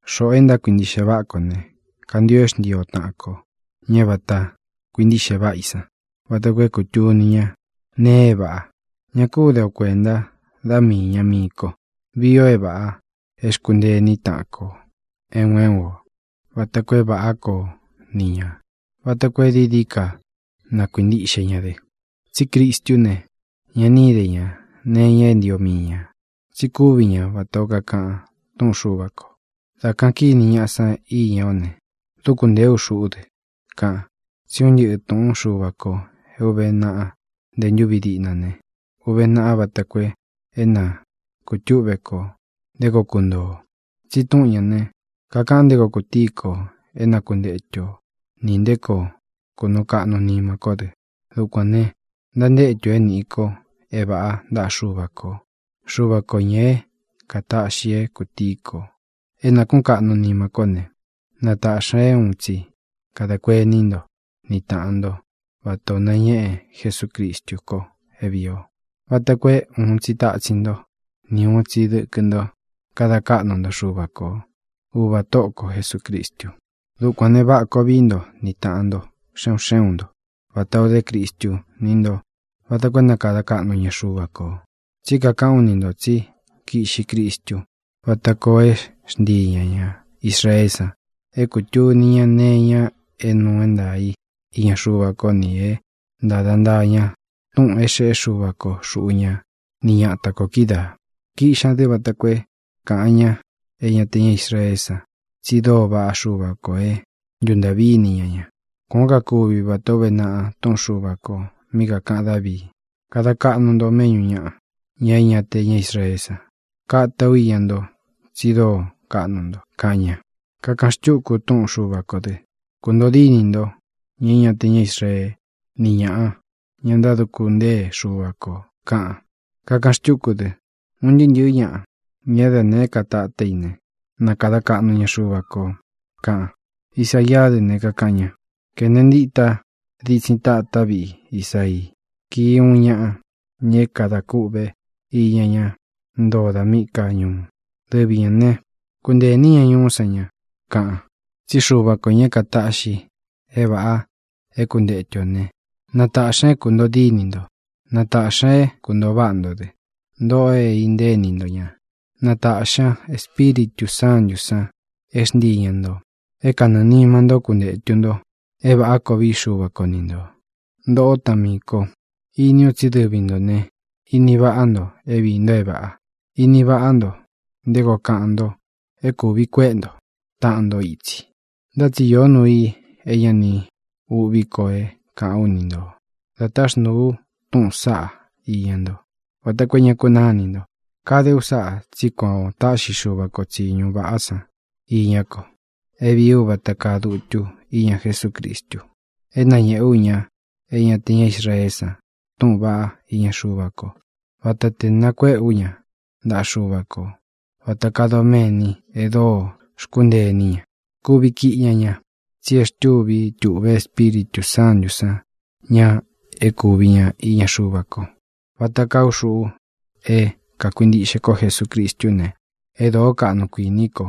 Xoꞌō e ntákuintiꞌxe váꞌa kō ne, kantio é xntii o taꞌan kō, ña é vata kuintíꞌxe váꞌa i san, vata koo é kūtuni ña nee é vāꞌa. Ña kú de o kuēnta da míi īña mii ko. Vii o é vāꞌá, e xkúntee iní taꞌan kō, é un é un ō, vata koo é vāꞌá koo ni ñā, vata koo é dií dií ka na kuīntiꞌxe ña dɨ. Tsí Cristú ne, ña ni íde ña nee iña é ntio mii ñā. Tsi kúvi ña vatā ó kakaꞌan túꞌun Xuva kō: “Dā kaꞌan kíni ñaꞌa san íña ó ne, dúku ntēé u xuꞌú dɨ”, kaꞌan. Tsí un ntɨꞌɨ̄ túꞌun Xuva kō é ūve naꞌa nte ntúvi diꞌna ne, úvē naꞌa vata koo é na kūtúꞌve kō nté koo kuntoo ō. Tsi túꞌun ñā ne, kakaꞌan nté koo kutíi kō é na kuntetu o nī nté koo kunuu kaꞌnu nima kó dɨ. Dukuān ne, ntantétu ō é nīꞌi ko é vāꞌá ntaꞌa Xuva kō. Xuva kō, ñá é kātaꞌxi é kūtíi kō, é nākuꞌún kaꞌnu nima kó ne, na tāꞌxi ña é uun tsi kadā kuení nto ni tāꞌan ntó vatā o nañéꞌe Jesucristu ko é vīi o, vata koo é uun tsi tatsin ntó ni ūun tsi dɨkɨ nto kada káꞌnu nto Xuva ko, Uvā Tóꞌo ko Jesūcristu. Dukuān ne, váꞌa koo vií nto ni tāꞌan nto xe un xé un nto vatā o dé Cristu ni ntó vata koo é na kada kaꞌnu ña Xuva kō. Tsí kakaꞌán u ni ntō tsi kíꞌxi Cristu váta koo é xntii ñā ña Israeé san é kūtuni ña nee iña é nuu é ntaā í iña Xuva kó nī é ntāda ntaa ña túꞌūn é xeꞌé Xuva ko xuꞌu ña ni ñata kō kídaā. Kíꞌxi ñā dɨ vata koo é kāꞌan ña é ña te ña Israeé san tsi dóo vaꞌá Xuva kō é ntuntāꞌví ini ña ña. Kuān ó kakuvi vatā ó uve naꞌa túꞌun Xuva kō mí kākaꞌan Dávii: Kada kaꞌnu ú nto méꞌñū ñaꞌa, ñá é ña te ña Israeé san. Kata ú iña nto tsi dóo kaꞌnu nto, kaꞌan ña. Kakaꞌan xtúku túꞌun Xuva kō dɨ: Kuntōo dínī ntó, ña é ña te ña Israeé, ni ñāꞌa, ña ntáduku ntée Xuva kō, kaꞌan. Kakaꞌan xtúku dɨ: Un ntɨɨ́ ntɨ̄ɨ́ ñaꞌa, ña da nēé ka tatá i ne, ¡na kada kaꞌnu ña Xuva kō! kaꞌan. Isaiá dɨ ne, kakaꞌan ña: Kene ntita ditsin tatá viꞌi Isaii. Kii uun ñaꞌa, ña é kadā kûꞌvé iña ñá ntoo da míꞌī ká ñuu. Dɨvi ñā ne, kuntee ini ñá ñuú san ña, kaꞌan. Tsí Xuva kō, ña é kataꞌxi é vāꞌa é kuntetu ō né, na tāꞌxi ña é kuntōo díni nto; na tāꞌxi ña é kuntōo váꞌa nto dɨ, ntoꞌo é intée ini nto ña. Na tāꞌxi ña Espíritū Sántū san é xntii ña ntō é kanɨɨ̄ nima ntó kuntētu nto é vāꞌá koo vií Xuva ko ni ntō. Ntōꞌó taꞌan miī ko, iní u tsí dɨvi ntō ne, ini váꞌa nto é viī nto é vāꞌa. Ini váꞌa nto nté koo kaꞌan nto é kūvi kuéꞌe nto taꞌan nto itsi. Ntá tsi iō nuu i é ña ni uꞌví ko é kāꞌán u ni nto dā táxnūu u túꞌūn saꞌá iña ntó, vata koo é ña kunáa inī nto. Kade u sáꞌā tsí kuan ō táꞌxi Xuva ko tsīñu vaꞌá san iñá ko é vīí u vata kaa dutu íña Jesúcristu, é nañēꞌe ú ña é ña te ña Israeé san túꞌūn vaꞌá iña Xuva ko. Vata tē nakuéꞌe ú ña ntaꞌa Xuva kō vata kaa doméni e dóo xkúntee iní ña. Kuvi kiꞌi ña ña, tsi e xtúvi tūꞌve Espíritū Sántū san ña é kūvi ña iña Xuva ko. Vata kaa ú xuꞌu é kākuintiꞌxe kó Jesucristú ne, e dóo kaꞌnu kuiní ko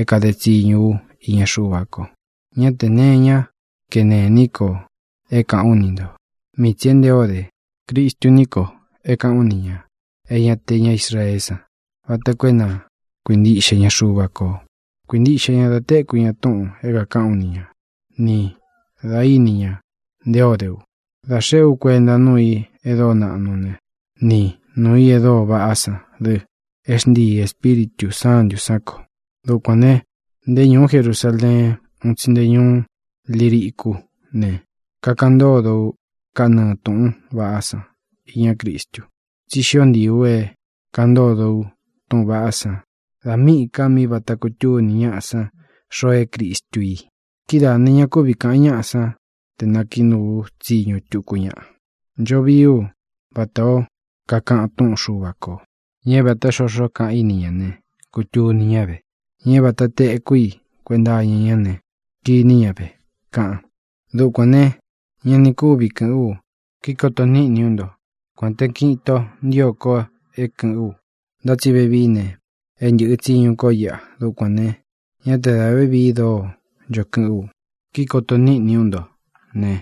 é kāde tsiñu ú iña Xuva ko. Ñá tē nee iñá kenē iní ko é kāꞌán u ni ntō, mii tsī é nté ō dé Cristu ní ko é kāꞌán u nī ña é ña te ña Israeé san vata koo é na kuintiꞌxe ña Xuva kō. Kuīntiꞌxe ña da téku ña túꞌūn é kākaꞌán u ni ña, ni dā íni ña nté ō dé u dá xeꞌé u kuenta nuu i e dóo naꞌnu ne, ni nuū i e dóo vaꞌá san dɨ é xntiī Espíritū Sántū sán ko. Dukuān ne, nté ñūú Jerusaleen ún tsi nte ñuú Liricú ne, kakaꞌan ntódo ú kanɨɨ̄ túꞌūn vaꞌá san iñá Cristu. Tsi xió ntiī u é kāꞌan ntódo u túꞌūn vaꞌá san da míꞌī ka mí vāta kutúni ñáꞌa san xoo é Cristu i. Kidáā ne, ña kúvi kāꞌan ñáꞌa san te nākiꞌi nuu ú tsiñu tuku ñaꞌa. Ncho vií u vatā ó kakaꞌan túꞌun Xuva kō: Ña é vāta xoxo kaꞌan í ni ñā ne, kutuni ñá ve. Ña é vāta teku í kuenta iña ñá ne, kiní ña ve, kaꞌan. Dukuān ne, ña ni kúvi kɨ̄ꞌɨ́n u kikoto níꞌni ú nto, kuān té kiꞌin itō ntío ko é kɨ̄ꞌɨ́n u. Ntá tsi vevií ne, é ntɨ̄ꞌɨ tsiñu kó iꞌa. Dukuān ne, ñá te dā vévii dóo ncho kɨꞌɨ́n u, kíkoto níꞌni ú nto ne,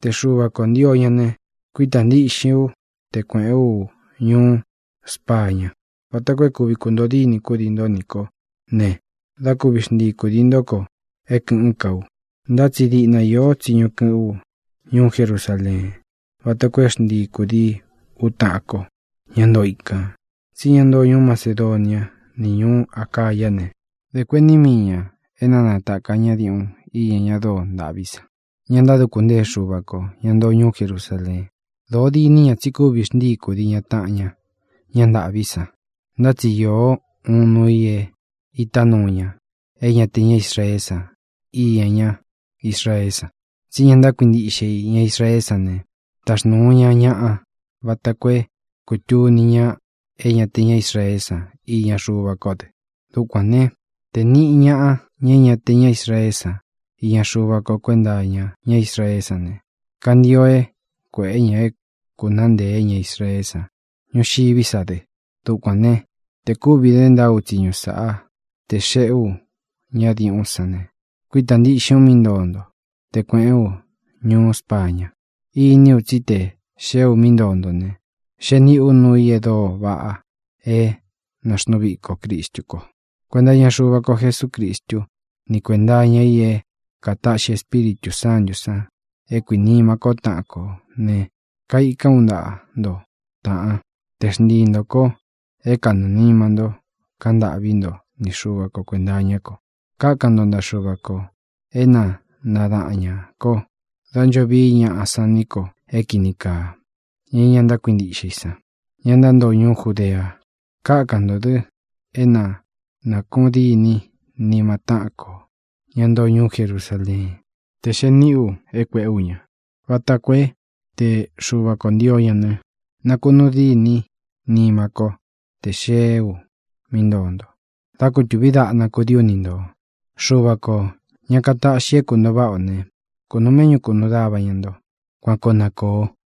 te Xuva kō ntio ña ne, kuítā ntiꞌxin ú te kuēꞌén u ñuú Spaña vata koo é kuvi kuntōo díni kúdii nto nī kó ne, dá kuvi xntii kūdii ntó ko é kɨ̄ꞌɨ́n ka u. Ntá tsi diꞌna iō tsíñu kɨꞌɨ́n u ñuú Jerusaleen vata koo é xntii kūdií u taꞌan ko, ña ntoo ikān. Tsí ña ntoo ñuú Macedonia ni ñuú Acayá ne, dē kuení mii ñā é na natāka ñá diuꞌun iña ña dóo ntāꞌví san, ña ntáduku ntée Xuva kō, ña ntoo ñuú Jerusaleen. Dōo diní ña tsí kuvi xntii kūdii ña taꞌan ña, ñá ntāꞌví san. Ntá tsi īó uun nuu i é ītá nuu ña é ña te ña Israeé san iña ñá Israeé san. Tsí ña ntákuintiꞌxe i, ña Israeé san ne, taxnūu ña ñaꞌa vata koo é kūtuni ña é ña te ña Israeé san iña Xuva kó dɨ. Dukuān né, te nīꞌi ñaꞌa, ña é ña te ña Israeé san, iña Xuva kó kuenta iña ñá Israeé san ne, kantio é kuēꞌé ña é kūnaá ntēé ña Israeé san ñuxiví sa dɨ. Dukuān ne, te kúvi dé ntaá u tsiñu sáꞌa, tē xeꞌe ú ña diuꞌún san ne, kuítā ntiꞌxin ú mí ntoo nto te kuēꞌén u ñuú Spaña. Iní u tsí te xēé u mí ntoo nto ne, xee níꞌī ú nuu i e dóo vaꞌa é nāxnuu viko Cristú ko. Kuenta iña Xuva ko Jesúcristu, ni kuénta iña i é kātaꞌxi Espíritū Sántū san é kuīnima kó taꞌan kō ne, kaikan ú ntaꞌa nto, tāꞌán, te xntii ntō ko é kanɨɨ̄ nima ntó kaꞌan ntâꞌví nto ni Xuva ko kuēnta iñá ko. Kákan nto ntaꞌa Xuva kō é na nadaꞌan ñā ko dá ncho vií ñaꞌa san ní ko é kīni kaa, ña é ña ntákuintiꞌxe i san, ña ntántoo ñuú Judea. Kákan ntō dɨ é na nākuꞌun dîní nima táꞌan kō, ña ntoo ñuú Jerusaleen, tē xee niꞌí u é kuēꞌé u ña, vata koo é, te Xuva kō ntio ña ne, nakunuu dîní nimá ko tē xeé u mí ntoo nto, dá kūtuví daꞌna kudií u ni ntō. Xuva kō, ña katáꞌxi é kuntōo váꞌa ō ne, kunūu méꞌñu kunuu dava ña nto. Kuan koo na kōo.